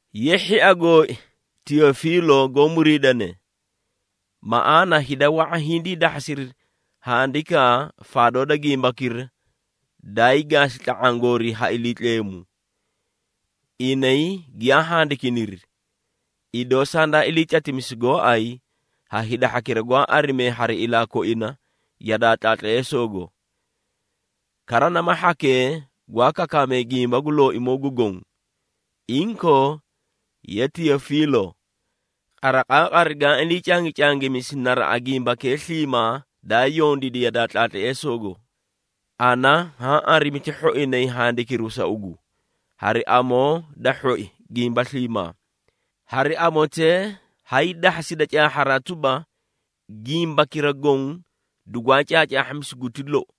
Ye, hhia gooi, Teyofiilo goó muriidane: Maꞌaana hida wa⁄a hindii dahhasiri handikaa faadoo da gimbakira daay gaasi tla⁄aã goorii ha Iliitleemu. Inay giyaa handikiniri, idoo sandaa ilii catimisi gooay ha hida hhakira gwaa arimee hari ilaa koina yadaa tlaatleesoogo. Kara nama hhakee gwaa kakaakame gimba gu Looimoo gu Goõ. Inkoo, ye Teyofiilo, qariqaaqari gaã ilii cangicangimisi naraꞌa gimbakee sliimaa daa yondiidi yadaa tlaatleesoogo, ana haã arimi ti hhoinay handikiru sa ugu, hari amoo da hhoi gimba sliimaa. Hari amotee, hay dahhasida caahharaa tuba, gimbakira goõ dugwaa caacaahhamisi guti lou.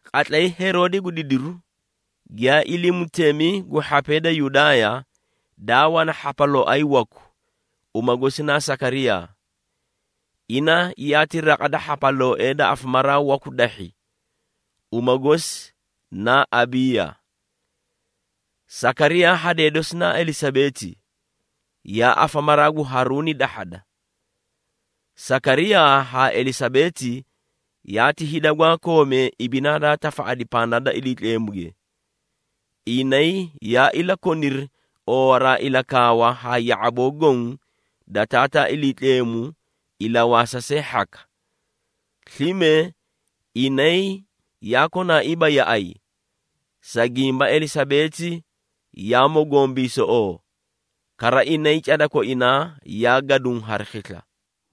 Qatlay Heroode gu didiru giyaa ilii mutemi gu hhapee da Yudaaya, daa wana hhapalooay waku, uma gosi naa Sakariyaa. Ina yaati raqa da hhapalooee da afamaraa waku dahhi, uma gosi naa Abiiya. Sakariyaa hadee dosi naa Elisabeeti, yaa afamaraa gu Haruuni dahhada. Sakariyaa haa Elisabeeti yaati hida gwaa koomee ibinaa daa tafaꞌadi pandaa da Iliitleemuge. Inay yaa ilakoniri oowaraa ilakaawa haa ya⁄aboo goõ da Taataa Iliitleemu ilawaasa see hhaka. Slime inay yaa konaaiiba yaꞌay, sa gimba Elisabeeti yaa mogombiisoꞌoo, kara inay, cada koinaa yaa gaduũ hari khisla.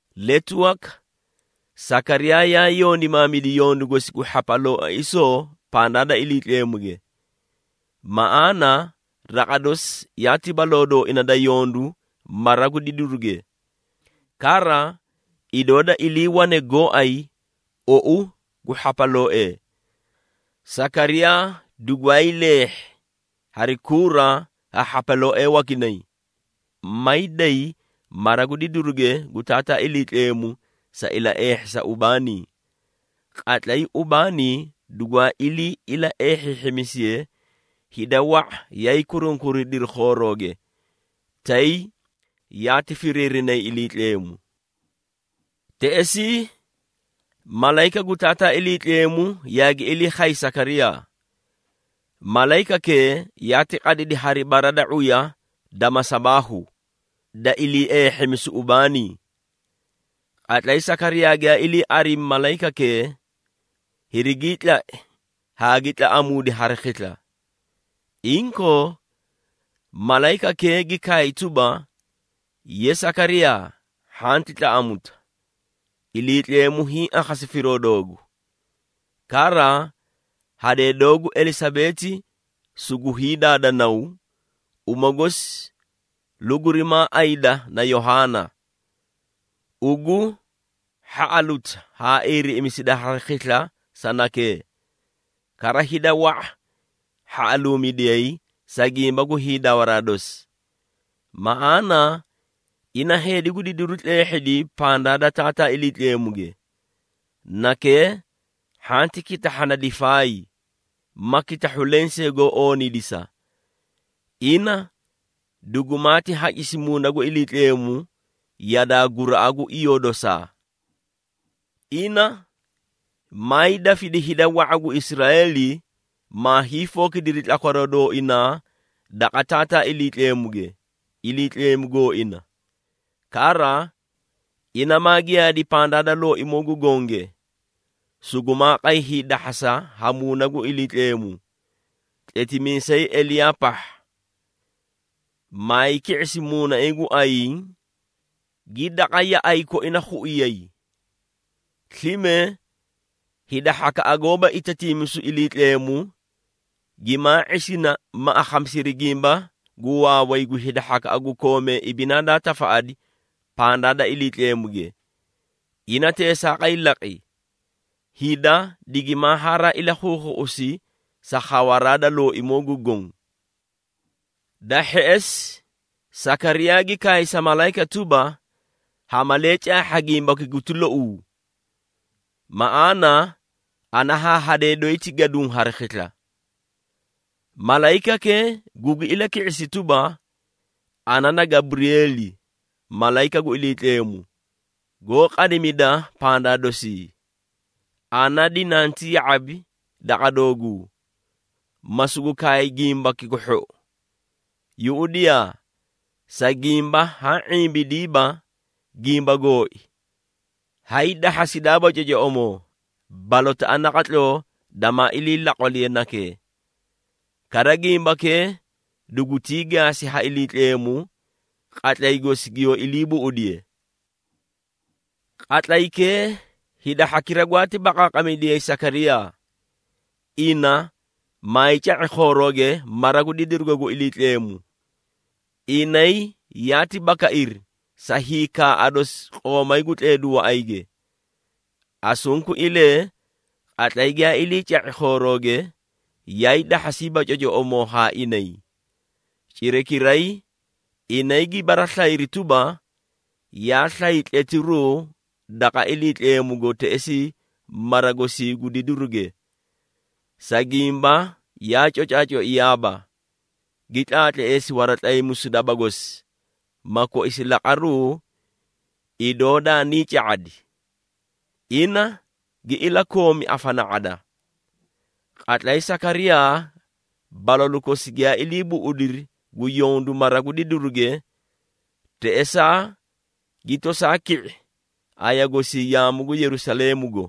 Letu waka, Sakariyaa yaa yondimaamidi yondu gosi gu hhapalooaisoo pandaa da Iliitleemuge. Maꞌaana raqa dosi yaati baloo dooina da yondu mara gu didiruge. Kara, idoo da iliiwane gooay ou gu hhapalooee, Sakariyaa dugwaay leehhi hari kuura ha hhapalooee wakinay, may day mara gu didiruge gu Taataa Iliitleemu sa ilaeehhisa ubaanii. Qatlay ubaanii dugwaa ilii ilaeehhiihhimisiye, hida wa⁄a yaay kurunkuridiri khoorooge, tay yaati firiirinay Iliitleemu. Teꞌesii malayika gu Taataa Iliitleemu yaagi ilii khay Sakariyaa. Malayikakee yaati qadidi hari bara da ⁄uya da masabaahu, da iliieehhimisuu ubaanii. Qatlay Sakariyaa giyaa ilii arimi malayikakee, hirigii tlai haa gi tlaꞌamuudi hari khisla. Inkoo, malayikakee gi kaay tuba, “Ye, Sakariyaa, hhanti tlaꞌamuta! Iliitleemu hiĩ akhasi firoo doogu. Kara hadee doogu Elisabeeti sugu hiidaada naw, uma gosi lugurimaa ayida na Yohaana. Ugu hhaꞌaluta haa iiriꞌimisida hari khisla sa nakee. Kara hida wa⁄a hhaꞌaluumidiyay, sa gimba gu hiidawaraa dosi. Maꞌaana ina heedi gu didiru tleehhidi pandaa da Taataa Iliitleemuge. Nakee hhanti kitahhana difaay, ma kitahhu lensee goó ooniidisa. Ina dugumaati hacisi Muuna gu Iliitleemu yadaa guraꞌa gu iyoo dosaa. Ina maay dafidi hida wa⁄a gu Israeeli, maa hiifookidiri tlakwaroo dooinaa daqa Taataa Iliitleemuge, Iliitleemu gooina. Kara, ina maa giyaadi pandaa da Looimoo gu Gonge, sugumaa qay hiidahhasa ha Muuna gu Iliitleemu, tletimiisay Eliyaa pahha. Maay ki⁄isi muunaiĩ gu ayiĩ, gi daqa yaꞌay koinay khuiyay. Slime, hida hhakaꞌa gooba itatiimisu Iliitleemu, gimaa ⁄isina ma akhamisiri gimba gu waaway gu hida hhakaꞌa gu koomee ibinaa daa tafaꞌadi pandaa da Iliitleemuge. Ina teesaaqay laqi, hida digima haraa ilakhuukhuꞌusi sa khawaraa da Looimoo gu Goõ.” Da hheꞌesi Sakariyaa gi kaay sa malayika tuba, “Ha malee caahha gimbaki guti louu? Maꞌaana ana haa hadee doyi ti gaduũ hari khisla.” Malayikakee gugi ilaki⁄isi tuba, “Ana na Gaburiyeeli, malayika gu Iliitleemu, goó qadimida pandaa dosii. Ana dinanti ya⁄abi daqa dooguu, ma sugu kaay gimbaki gu hhou. Yuꞌudiyaa! Sa gimba haa ⁄imbidiiba gimba gooi, hay dahhasidaaba cocoꞌomoo, balotaꞌa naqatloo damaa ilii laqwaliye nakee. Kara gimbakee dugutii gaasi ha Iliitleemu, qatlay gosi giyoo ilii buꞌudiye!” Qatlaykee, hida hhakira gwaati baqaaqamidiyayi Sakariyaa, ina maay ca⁄i khoorooge mara gu didirugo gu Iliitleemu. Inay yaati bakairi sa hiikaaꞌa dosi qoomay gu tleedu waꞌayge. Asunkuilee, qatlay giyaa ilii ca⁄i khoorooge, yaay dahhasiiba cocoꞌomoo haa inay. Cirakiray inay gi baraslayiri tuba, yaa slay tletiruu daqa Iliitleemugo teꞌesii mara gosii gu didiruge. Sa gimba yaa cocaacoiyaaba, gi tlaatleesi waratlaymisu daba gosi, ma koisi laqaruu idoo daanii ca⁄adi. Ina gi ilakoomi afana⁄ada. Qatlay Sakariyaa balalu kosi giyaa ilii buꞌudiri gu yondu mara gu didiruge, teꞌesaa gi tosaa ki⁄i aya gosii yaamu gu Yerusaleemugo.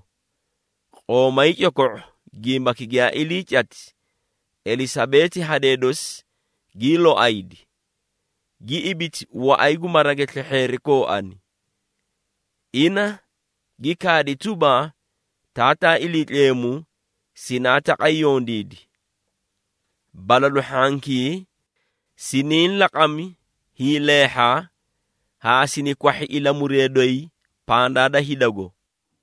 Qoomay coko⁄o gimbaki giyaa ilii cati, Elisabeeti hadee dosi gii loaydi, gi ibiti waꞌay gu marage slehheeri kooani. Ina gi kaadi tuba, “Taataa Iliitleemu, sinaa taqay yondiidi! Balalu hhankii, siniĩ laqami hiileehha haa sini kwahhi ilamuree doyi pandaa da hidago.”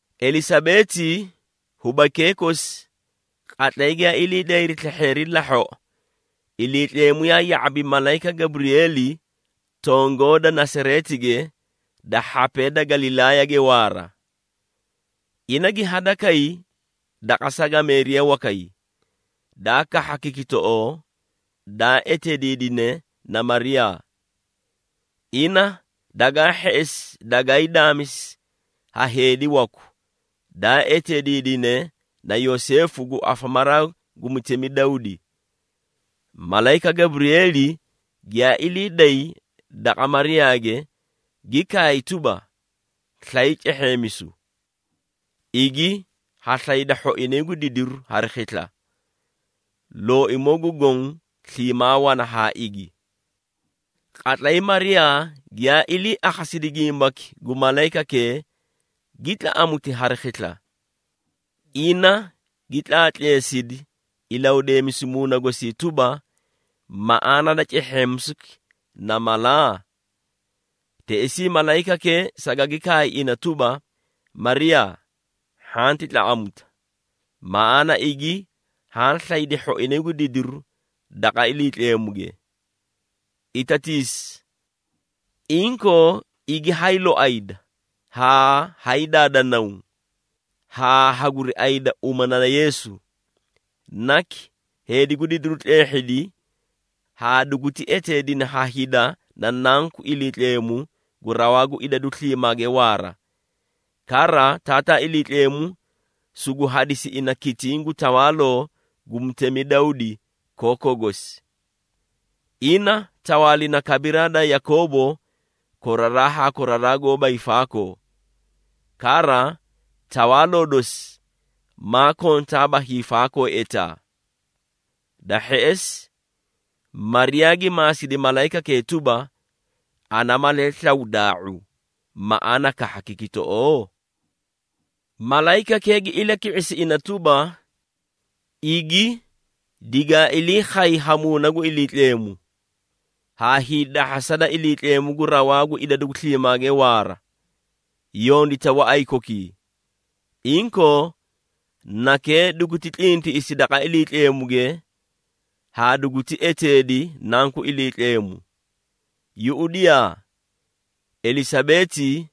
Elisabeeti hubaykee kosi, qatlay giyaa ilii dayri slehheeri lahhoꞌo, Iliitleemu yaa ya⁄abi malayika Gaburiyeeli tongoo da Nasareetige da hhapee da Galilaayage waara. Ina gi hadakay daqa sagameeriya wakay, daa kahha kikitoꞌoo, daa eteediidine na Mariyaa. Ina dagaa hheꞌesi dagaay daamisi ha heedi waku, daa eteediidine na Yoseefu gu afamaraa gu mutemi Dawdi. Malayika Gaburiyeeli giyaa ilii day daqa Mariyaage gi kaay tuba, “Slay cehheemisu, igi haa slaydi hhoinay gu didiru hari khisla! Looimoo gu Goõ sliimaa wana haa igi!” Qatlay Mariyaa giyaa ilii akhasidi gimbaki gu malayikakee, gi tlaꞌamuti hari khisla. Ina gi tlaatleesidi ilahudeemisu muuna gosii tuba, maꞌaana da cehheemisuki na mala? Teꞌesii malayikakee sagagi kaay ina tuba, “Mariyaa, hhanti tlaꞌamuta! Maꞌaana igi haã slaydi hhoinay gu didiru daqa Iliitleemuge. Itatiisi! Inkoo, igi hay loayda haa hay daada naw, haa haguri ayida uma na Yeesu. Naki, heedi gu didiru tleehhidi haa duguti eteedina ha hida na Nanku Iliitleemu gu Rawaa gu Idadu Sliimaage Waara. Kara Taataa Iliitleemu sugu hadisi ina kitiĩ gu tawaaloo gu mutemi Dawdi, kookoo gosi. Ina tawaalina kabiraa da Yakoobo koraraa haa koraraa goóba hiifaakoo. Kara Tawaaloo dosi maa kontaaba hiifaakoo etaa!” Da hheꞌesi Mariyaa gi maasidi malayikakee tuba, “Ana malee slaw daa⁄u, maꞌaana kahha kikitoꞌoo?” Malayikakee gi ilaki⁄isi ina tuba, “Igi digaa ilii khayi ha Muuna gu Iliitleemu, haa hiidahhasa da Iliitleemu gu Rawaa gu Idadu Sliimaage Waara, yondita waꞌay kokii. Inkoo, nakee duguti tlintiꞌisi daqa Iliitleemuge haa duguti eteedi, Nanku Iliitleemu. Yuꞌudiyaa, Elisabeeti,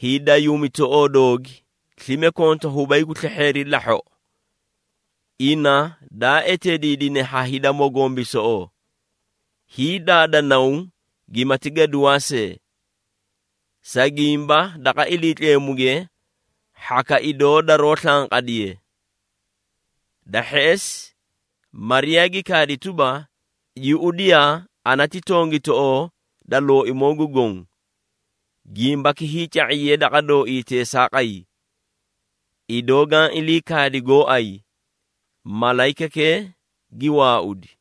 hiidayuumitoꞌoo doogi, slime konta hubay gu slehheeri lahhoꞌo. Ina daa eteediidine ha hida mogombiisoꞌoo, hiidaada naw gimati gaduwaa see, sa gimba daqa Iliitleemuge hhaka idoo daroó slanqadiye.” Da hheꞌesi Mariyaa gi kaadi tuba, “Yuꞌudiyaa, ana ti tongitoꞌoo da Looimoo gu Goõ. Gimbaki hiica⁄iye daqa dooii teesaaqay, idoo gaã ilii kaadi gooay.” Malayikakee gi waaudi.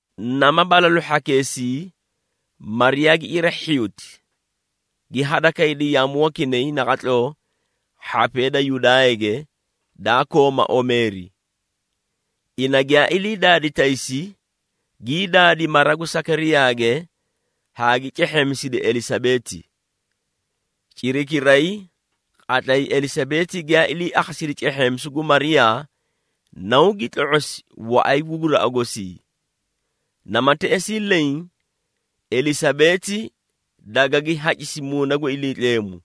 Nama balalu hhakeesii, Mariyaa gi cira hhiyuti, gi hadakaydi yaamu wakinay naqatloo hhapee da Yudaayage, daa kooma omeeri. Ina giyaa ilii daadi taysi, gii daadi mara gu Sakariyaage haa gi cehheemisidi Elisabeeti. Cirakiray qatlay Elisabeeti giyaa ilii akhasidi cehheemisu gu Mariyaa, naw gi tlo⁄osi waꞌay gu guraꞌa gosii. Nama teꞌesii leẽ Elisabeeti dagagi hacisi Muuna gu Iliitleemu.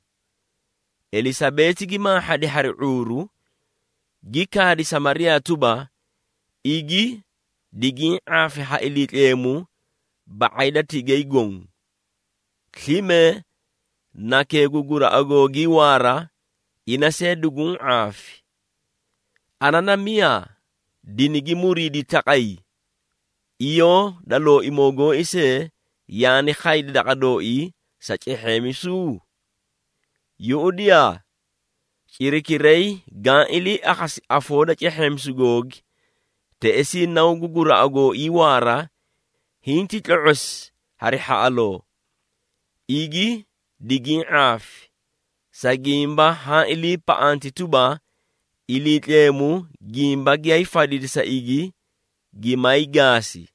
Elisabeeti gi maahhadi hari ⁄uuru, gi kaadi sa Mariyaa tuba, “Igi, digiĩ ⁄aafi ha Iliitleemu ba⁄ay da tigay goõ! Slime nakee gu guraꞌa googii waara, ina see duguũ ⁄aafi. Ana na miyaa dinigi muriidi taqay, iyoo da Looimoo gooi see yaani khaydi daqa dooii sa cehheemisuu? Yuꞌudiyaa, cirakiray gaã ilii akhasi afoo da cehheemisu googi, teꞌesii naw gu guraꞌa gooii waara, hinti tlo⁄osi hari hhaꞌaloo. Igi digiĩ ⁄aafi! Sa gimba haã iliipaꞌanti tuba, Iliitleemu gimba giyaay fadidi sa igi gimaay gaasi!”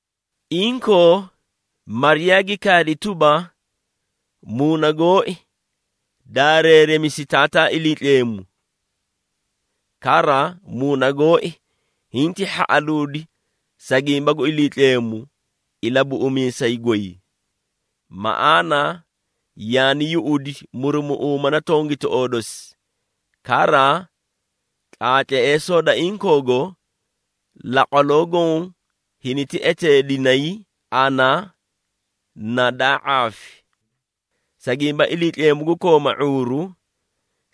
Inkoo, Mariyaa gi kaadi tuba, “Muuna gooi, daareeremisi Taataa Iliitleemu. Kara, muuna gooi hinti hhaꞌaluudi sa gimba gu Iliitleemu, Ilabuꞌumiisay goy! Maꞌaana yaani yuꞌudi, murumuꞌuuma da tongitoꞌoo dosi. Kara, tlaatleesoo da inkoogo, laqwaloo goõ hiniti eteedinay ana na daa ⁄aafi. Sa gimba Iliitleemu gu kooma ⁄uuru,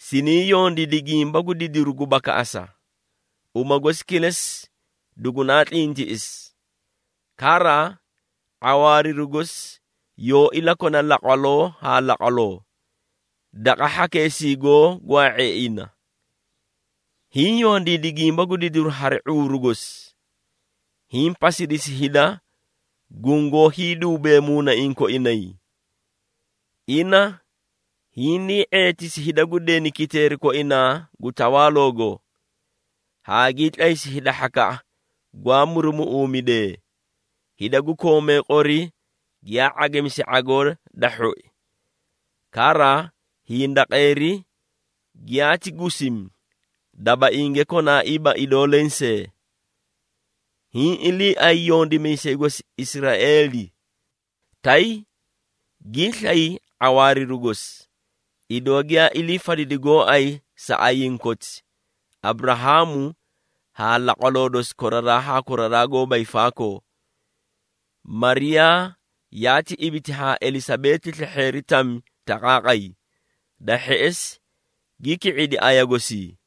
siniĩ yondiidi gimba gu didiru gu bakaꞌasa, uma gosi kilesi dugunaa tlintiꞌisi! Kara, ⁄awaariru gosi yoó ilakona laqwaloo haa laqwaloo, daqa hhakeesii goó gwaa⁄ee ina. Hiĩ yondiidi gimba gu didiru hari ⁄uuru gosi, hiĩ pasidisi hida gungoó hiiduubee muunaiĩ koinay. Ina hinii ⁄eetisi hida gu deni kiteeri koinaa gu tawaaloogo, haa gii tlaysi hida hhakaꞌa gwaa murumuꞌuumidee. Hida gu koomee qori giyaa ⁄agimisi ⁄agoo da hhoi. Kara hindaqeeri giyaati gusimi, dabainge konaaiiba idoo lensee. Hiĩ iliiay yondimiisay gosi Israeeli, tay giislay ⁄awaariru gosi, idoo giyaa ilii fadidi gooay sa ayiĩ koti, Aburahaamu haa laqwaloo dosi koraraa haa koraraa goóba hiifaakoo.” Mariyaa yaa ibiti haa Elisabeeti slehheeri tami taqaaqay. Da hheꞌesi gi ki⁄idi aya gosii.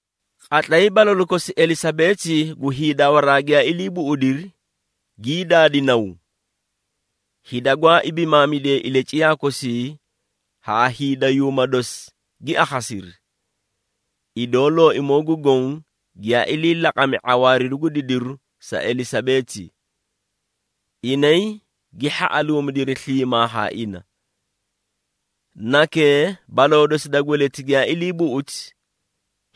Qatlay balalu kosi Elisabeeti gu hiidawaraa giyaa ilii buꞌudiri, gii daadi naw. Hida gwaa ibimaamidee ilaciyaa kosi haa hiidayuuma dosi gi akhasiri, idoo Looimoo gu Goõ giyaa ilii laqami ⁄awaariru gu didiru sa Elisabeeti. Inay gi hhaꞌaluumidiri sliimaa haa ina. Nakee, baloo dosi da gweleti giyaa ilii buꞌuti,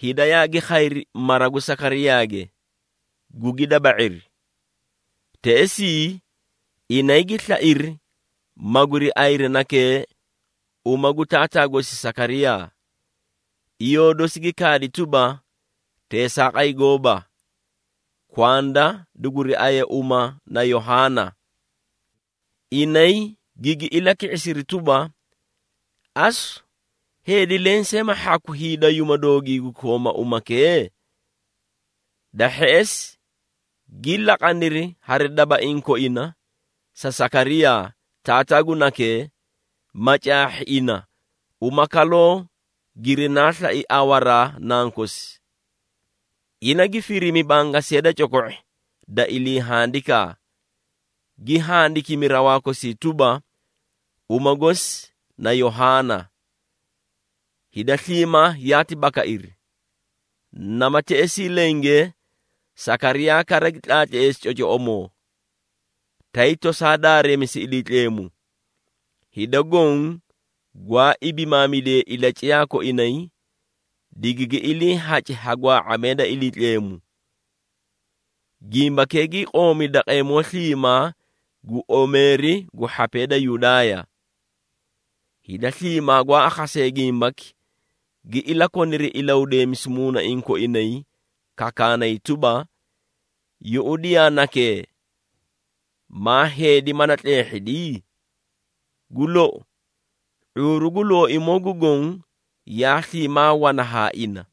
hida yaagi khayri mara gu Sakariyaage, gugi daba⁄iri. Teꞌesii inay gi slairi maguri ayiri nakee uma gu taataa gosi Sakariyaa. Iyoo dosi gi kaadi tuba, “Teesaaqay gooba! Kwanda duguri aye uma na Yohaana.” Inay gigi ilaki⁄isiri tuba, “Asu, heedi lensee ma hhaku hiidayuuma doogii gu kooma umakee?” Da hheꞌesi gi laqaniri hari dabaiĩ koina sa Sakariyaa, taataa gu nakee, ma caahhiri ina uma kaloo girinaa slai awaraa nankosi. Ina gi firimi bangasiya da coko⁄i da ilii handikaa, gi handikimi rawaa kosii tuba, “Uma gosi na Yohaana.” Hida sliimaa yaati bakairi. Nama teꞌesii lenge, Sakariyaa kara gi tlaatleesi cocoꞌomoo, tay tosaa daareemisi Iliitleemu. Hida goõ gwaa ibimaamidee ilaciyaa koinay, digigi iliihaci ha gwaa⁄amee da Iliitleemu! Gimbakee gii qoomi daqeemoo sliimaa gu omeeri gu hhapee da Yudaaya. Hida sliimaa gwaa akhasee gimbaki, gi ilakoniri ilahudeemisu muunaiĩ koinay, kakaanay tuba, “Yuꞌudiyaa nakee, maa heedi mala tleehhidi?” Gu lou, ⁄uuru gu Looimoo gu Goõ yaa sliimaa wana haa ina.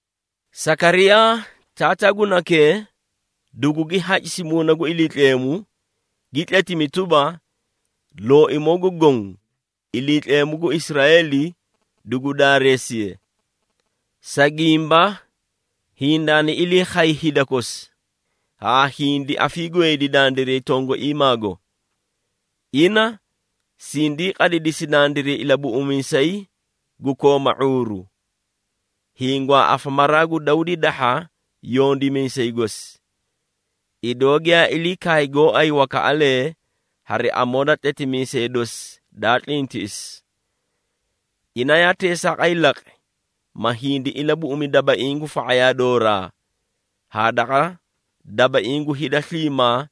Sakariyaa, taataa gu nakee dugugi hacisi Muuna gu Iliitleemu, gi tletimi tuba, “Looimoo gu Goõ, Iliitleemu gu Israeeli, dugu daareesiye, Sa gimba hindaani ilii khay hida kosi, haa hindi afiigweedi dandiray tongaiimaago. Ina sindii qadidisi dandiray Ilabuꞌumiisay gu kooma ⁄uuru, hiĩ gwaa afamaraa gu Dawdi dahha yondimiisay gosi, idoo giyaa ilii kaay gooay wakaꞌalee hari amoo da tletimiisee dosi daa tlintiꞌisi. Ina yaa teesaaqay laqi, ma hindi ilabuꞌumi dabaiĩ gu fa⁄ayaa dooraa haa daqa dabaiĩ gu hida sliimaa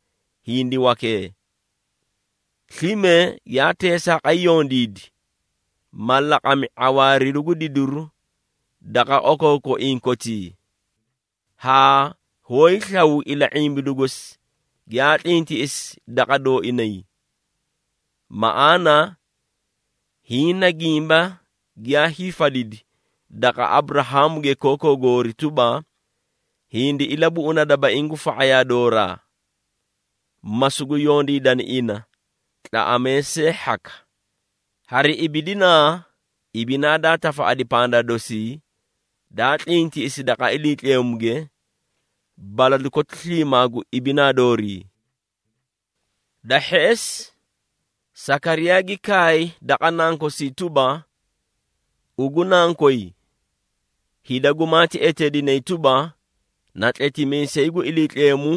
hindi wakee. Slime yaa teesaaqay yondiidi, ma laqami ⁄awaariru gu didiru daqa okookoiĩ kotii, haa hoóyi slaw ila⁄imbidu gosi giyaa tlintiꞌisi daqa dooinay. Maꞌaana hiĩ na gimba giyaa hiifadidi, daqa Aburahaamuge kookoo goori tuba, hindi ilabuꞌuna dabaiĩ gu fa⁄ayaa dooraa, ma sugu yondiidani ina, tlaꞌamee see hhaka, hari ibinaa, ibinaa daa tafaꞌadi pandaa dosi, daa tlintiꞌisi daqa Iliitleemuge, balalu koti sliimaa gu ibidinaa doori.” Da hheꞌesi Sakariyaa gi kaay daqa nankosii tuba, “Ugu nankoy, hida gumaati eteedinay tuba, na tletimiisay gu Iliitleemu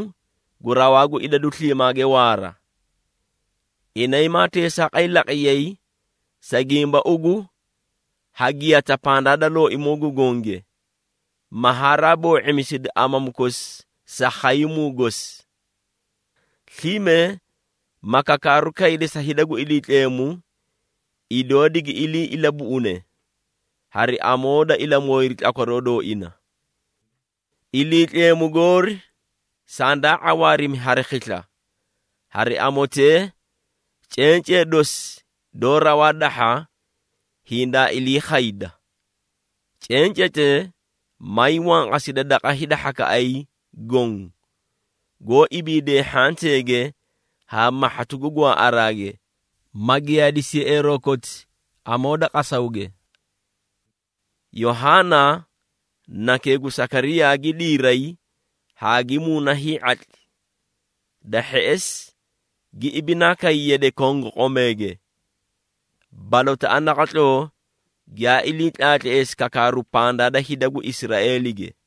gu Rawaa gu Idadu Sliimaage Waara. Inay maa teesaaqay laqiyay, sa gimba ugu ha giyata pandaa da Looimoo gu Gonge, ma haraa boo⁄imisidi amamu kosi sa khaymuu gosi. Slime ma kakaaru kaydi sa hida gu Iliitleemu, idoo digi ilii ilabuꞌune hari amoo da ilamooyiru tlakwaroo dooina. Iliitleemu goori sandaa ⁄awaarimi hari khisla, hari amotee, cencee dosi doó raw dahha, hindaa ilii khayda. Cencetee may wanqasidi daqa hida hhakaꞌay goõ, goó ibiidee hhanteege haa mahhatu gu gwaaꞌaraage, ma giyaadisi yeꞌeeroo koti amoo da qasawge.” Yohaana, nakee gu Sakariyaa gi diiray haa gi muuna hii⁄atli. Da hheꞌesi gi ibinaa kay yade kongoqomeege, balotaꞌa naqatloo giyaa ilii tlaatleesi kakaaru pandaa da hida gu Israeelige.